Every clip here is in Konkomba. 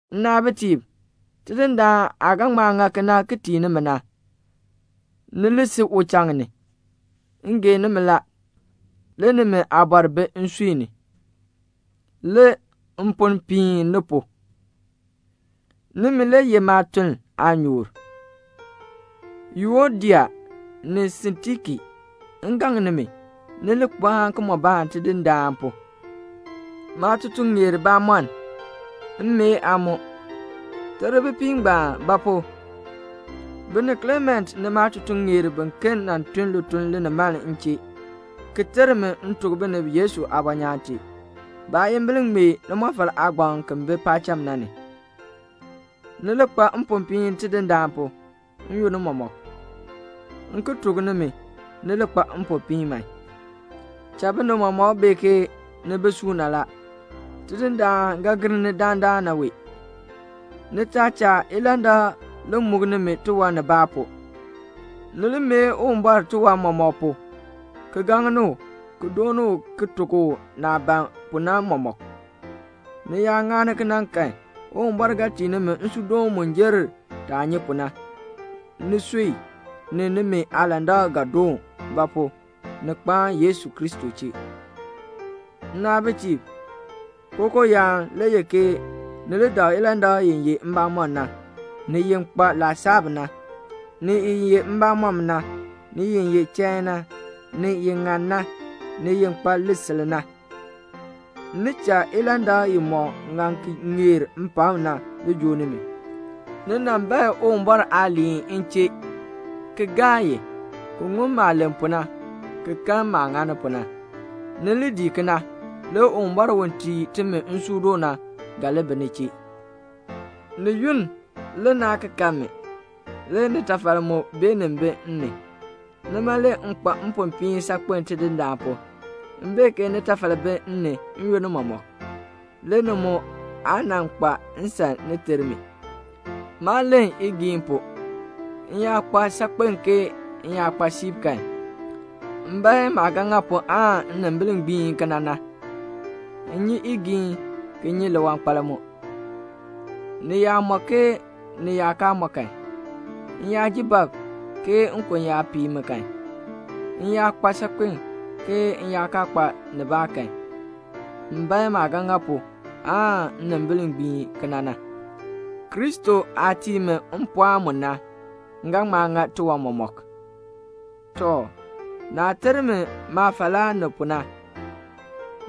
Nnaabitiib, Tidindaan aah ga ŋma ŋa kena ki tii nimi na, ni li si uchaŋ ni. M gee nimi la. Le nimi aabɔr bi nsui ni. Le mponn piin ni pu. Nimi, ni ye maatuln aanyoor la. Yuodia ni Sintiki, m gaŋ nimi, ni li kpaan kimɔbaan Tidindaan pu. Maatutuŋeer bamɔnn, m mee aa mu, ter bipiib ngbaan; ba pu? bi ni Klement ni maatutuŋeer biken nan tun lituln linimaln m chee, ki ter mi m tuk binib Yesu aabɔnyaan tee. Baayimbil ŋmee limɔfal aagbaŋ ki bi paacham na ni. Ni li kpa mpopiin Tidindaan pu, n-yoonn mɔmɔk. M ki tuk nimi, ni li kpa mpopiin man. Cha binib mɔmɔk bee ke ni bi suuna la. Tidindaan ga gir ni dandana wee. Ni taa cha ilandak li muk nimi tiwan nibaa pu. Ni li mee Uwumbɔr tiwan mɔmɔk pu, ki gaŋni u, ki dooni u ki tuk u naah ban pu na mɔmɔk. Ni yaa ŋani kena kan Uwumbɔr ga tii nimi nsuudoon mu jer taah nyi pu na. Nisui, ni nimi aalandak ga li doon; ba pu? ni kpaan Yesu Kristo chee. Nnaabitiib, kookooyaan le ye ni li dak ilandak i ye mbamɔn na, ni i kpa laasab na, ni i ye mbamɔm na, ni i ye chain na, ni i ŋan na, ni i kpa lisil na. Ni cha ilandak imɔk ŋan ki ŋeer mpakm na li joo nimi. Ni nan bae Uwumbɔr aaliin m chee, ki gaa i, ki ŋun maah len pu na, ki kan maah ŋani pu na. Ni li dii kena, le Uwumbɔr u tii timi nsuudoon na ga li bi ni chee. Ni yunn le naa kan mi; le nitafal mu beenin bi m ni. Nima le m kpa mpopiin saakpen Tidindaan pu. M bee ke nitafal bi m ni n-yoonn mɔmɔk; le ni mu aa nan kpa nsan ni ter mi. Maa len igiin pu. M yaa kpa saakpen ke m yaa kpa siib kan, m bae maah ga ŋa pu aan nnimbil gbiin kena na. M nyi igiin, ki nyi liwankpal mu. Ni yaa mɔ ke ni yaa kaa mɔ kan, m yaa ji bab, ke nkon yaa pii mi kan, m yaa kpa saakpen, ke m yaa kaa kpa nibaa kan, m bae maah ga ŋa pu aan nnimbil gbiin kena na. Kristo aah tii mi mpɔɔn mu na, m ga ŋma ŋa tiwan mɔmɔk. Tɔ, naah ter mi maafalaa ni pu na,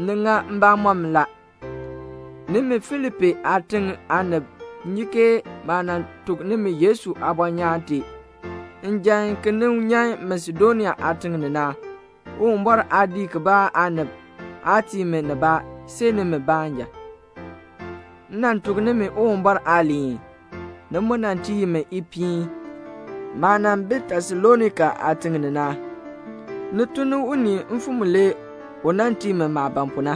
ni ŋa mbamɔm la. Nimi Filipi aatiŋ aanib nyi ke maah nan tuk nimi Yesu aabɔnyaan tee njan ki nin nyan Masedonia aatiŋ ni na, Uwumbɔr aadiik kibaa aanib aa tii mi nibaa, see nimi baanja. M nan tuk nimi Uwumbɔr aaliin. Ni mu nan tii mi ipiin. Maah nan bi Tesalonika aatiŋ ni na, ni tun ni unii mfim mulee u nan tii mi maah ban pu na.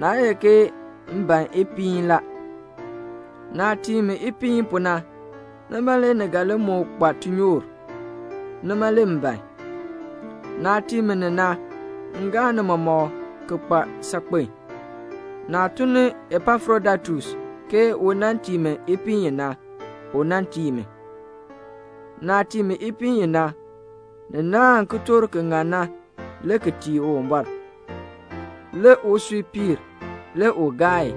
Naa ye ke m ban ipiin la. Naah tii mi ipiin pu na, nima le ni ga li moo kpa tinyoor. Nima le m ban. Naah tii mi ni na, m gaa ni mɔmɔk ki kpa saakpen. Naah tun ni Epafrodaitus ke u nan tii mi ipiin i na, u nan tii mi. Naah tii mi ipiin i na, ni naahn kitork ki ŋan na le ki tii Uwumbɔr, le usui piir, le u gaa.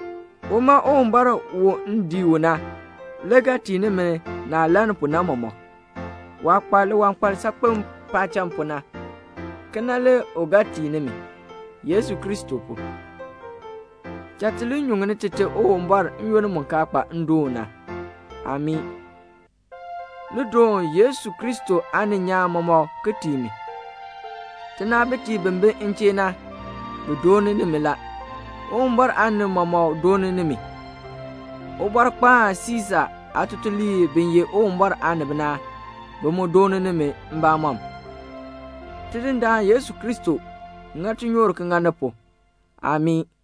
Uma Uwumbɔr u m dii u na, le ga tii nimi naah lann pu na mɔmɔk; waah kpa liwankpal saakpen paacham pu na, kena le u ga tii nimi, Yesu Kristo pu. Cha ti li nyuŋni Tite Uwumbɔr n-yoonn mu kaa kpa ndoon na. Amii. Ni doon Yesu Kristo aaninyaan mɔmɔk ki tii mi. Tinaabitiib bi bi m chee na, bi dooni nimi la. Uwumbɔr aanib mɔmɔk dooni nimi. Ubɔrkpaan Siisa aatutuliib bi ye Uwumbɔr aanib na, bi mu dooni nimi mbamɔm. Tidindaan Yesu Kristo ŋa tinyoor ŋa ni pu. [Amii.]